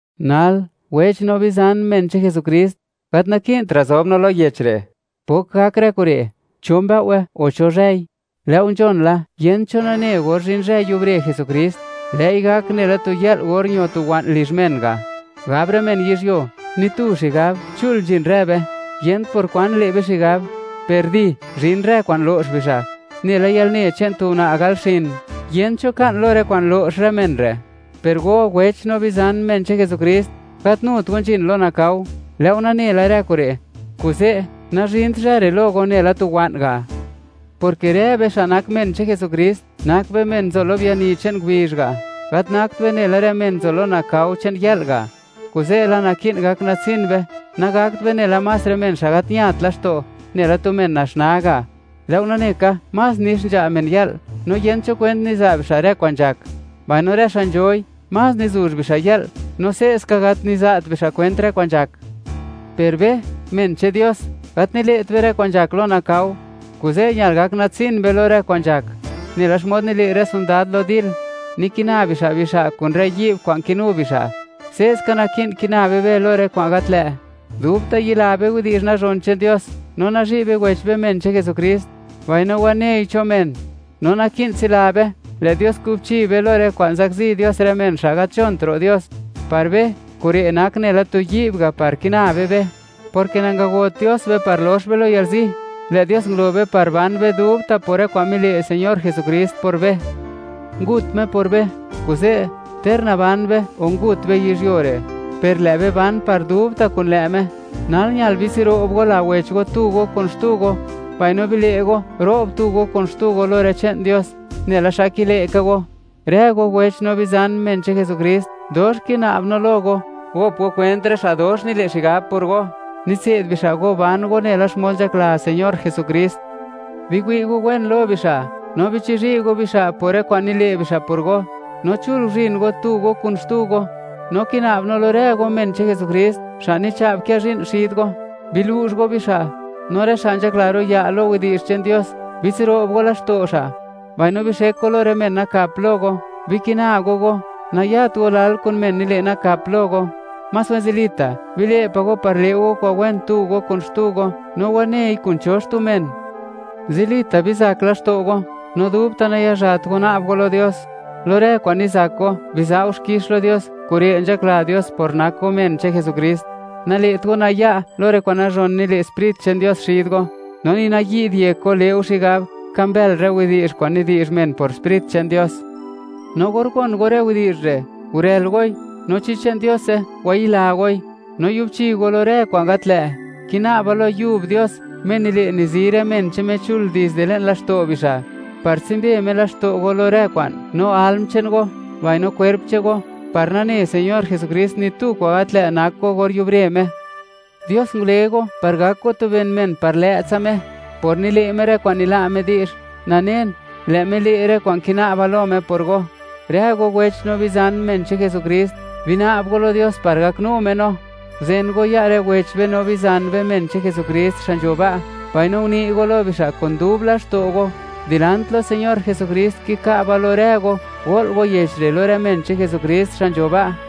Nal, wech no bizan, men che'n Jesukrist, gat naki'ntra' zob no lo yech re', pok gak rë kure', cho mbëo'we o cho zhëi; lë' go nzhon la, yent cho nane or zhin zhë yubre Jesukrist; lë'i gak nela tu yë'l or ño tu wa'n lizh men ga'. Gab rë men yizhyuo: “Ni tu xigab, chul nzhin rë be; yent por kwan le' be xigab”, per ¡di!, zhin rë kwa'n lo'x bixa', nela yalne che'n tu una' gal xin; yent cho ka'n lo rë kwa'n lo'x rë men re'. Per go, wech no bizan, men che'n Jesukrist; gat nut go nzhin lo nakao; lë' go nane la rë kure'. Kuze', nazhint zhë re' lo go nela tu wa'n ga', porke rë be xa' nak men che'n Jesukrist, nak be men nzo lo biani che'n ngubizh ga', gat nakt be nela rë men nzo lo nakao che'n yë'l ga'. Kuze' la, naki'n gak natsin be; nagakt be nela más rë men xa' gat ñat laxto', nela tu men naxnaa ga'. Lë' go nane ka, más nix nzha' men yë'l, no yent cho kwent niza' bixa' rë kwa'n nzhak; mbaino rë xa' nzhoi, más nizuzh bixa' yë'l, no se'ska gat niza't bixa' kwent rë kwa'n nzhak. Per be, men che'n Dios, gat nile't be rë kwa'n nzhak lo nakao, kuze' ñal gak natsin be lo rë kwa'n nzhak. Nela xmod nile' rë sondad lo dil, nikina bixa' bixa' kun rë yi'b kwa'n kinu bixa', se'ska naki'n kina be be lo rë kwa'n gat lë': Dubta' yila be widi'zh nazhon che'n Dios, no nazhi' be wech be, men che'n Jesukrist, mbaino wanei cho men; no naki'n tsila be, lë' Dios kubchi be lo rë kwa'n zakzi Dios rë men xa' gat nzhont ro' Dios. Par be, kure' nak nela tu yi'b ga' par kina be be, porke nangagot Dios be par lox be lo yalzi; lë' Dios ngulo be par ban be dubta' por rë kwa'n mile' Señor Jesukrist por be. Ngut Me por be; kuze', ter naban be o ngut be yizhyuo re', per lë' be ban par dubta' kun lë' Me. Nal ñal bitsiro'b go la wech go (bile' go, nayat laxto' wech go), tu go kun xtu go, mbaino bile' go, ro'b tu go kun xtu go lo rë che'n Dios, nela xa kile' ka go. Rë go wech no bizan, men che'n Jesukrist, dox kina'b no lo go, gop go kwent rë xa' dox nile' xigab por go, nitse'd bixa' go ban go nela xmod nzhakla Señor Jesukrist. Biwi' go wen lo bixa', no bichizhi' go bixa' por rë kwa'n nile' bixa' por go; no chul guzhin go tu go kun xtu go. No kina'b no lo rë go, men che'n Jesukrist; xa' nicha'b kë zhi'n xid go, bilu'zh go bixa' (biza' go kunsej bixa'); no rë xa' nzhakla ro' ya' lo widi'zh che'n Dios, bitsiro'b go laxto' xa'; mbaino bixek go lo rë men nakap lo go. Bikina go go, nayat go lal kun men nile' nakap lo go; más wen zilita' bile' pa' go par le' go kwa'n wen tu go kun xtu go, no wanei kun cho xtu men. Zilita' bizak laxto' go, no dubta' nayazhat go na'b go lo Dios. Lo rë kwa'n nizak go, biza' go xkix lo Dios; kure' nzhakla Dios por nak go men che'n Jesukrist. Nale't go naya' lo rë kwa'n nazhon nile' Sprit che'n Dios xid go, no ni nayi'd yek go, le' go xigab, ka mbël rë widi'zh kwa'n nidi'zh men por Sprit che'n Dios. No or gon go rë widi'zh re', gurël goi, no chi che'n Diose, wayila goi; no yubchi go lo rë kwa'n gat lë'. Kina'ba lo yub Dios, Me nile', nizi rë men che'n Me chul, dizde le'n laxto' bixa', par tsumbe Me laxto' go lo rë kwa'n, no alm che'n go, mbaino kwerp che'n go, par nane Señor Jesukrist ni tu kwan gat lë' nak go or yubre Me. Dios ngule go par gak go tu ben men par lë'tsa Me. Por nile' Me rë kwa'n nila' Me di'zh, nanen, lë' Me le' rë kwa'n kina'ba lo Me por go. Rë go wech no bizan, men che'n Jesukrist, bina'b go lo Dios par gaknu Me no. Guzen go ya' rë wech be no bizan be, men che'n Jesukrist xa' nzho ba', mbaino uni' go lo bixa' kun dub laxto' go. Dilant lo Señor Jesukrist, kika'ba lo rë go, go'l go yech re' lo rë men che'n Jesukrist xa' nzho ba'.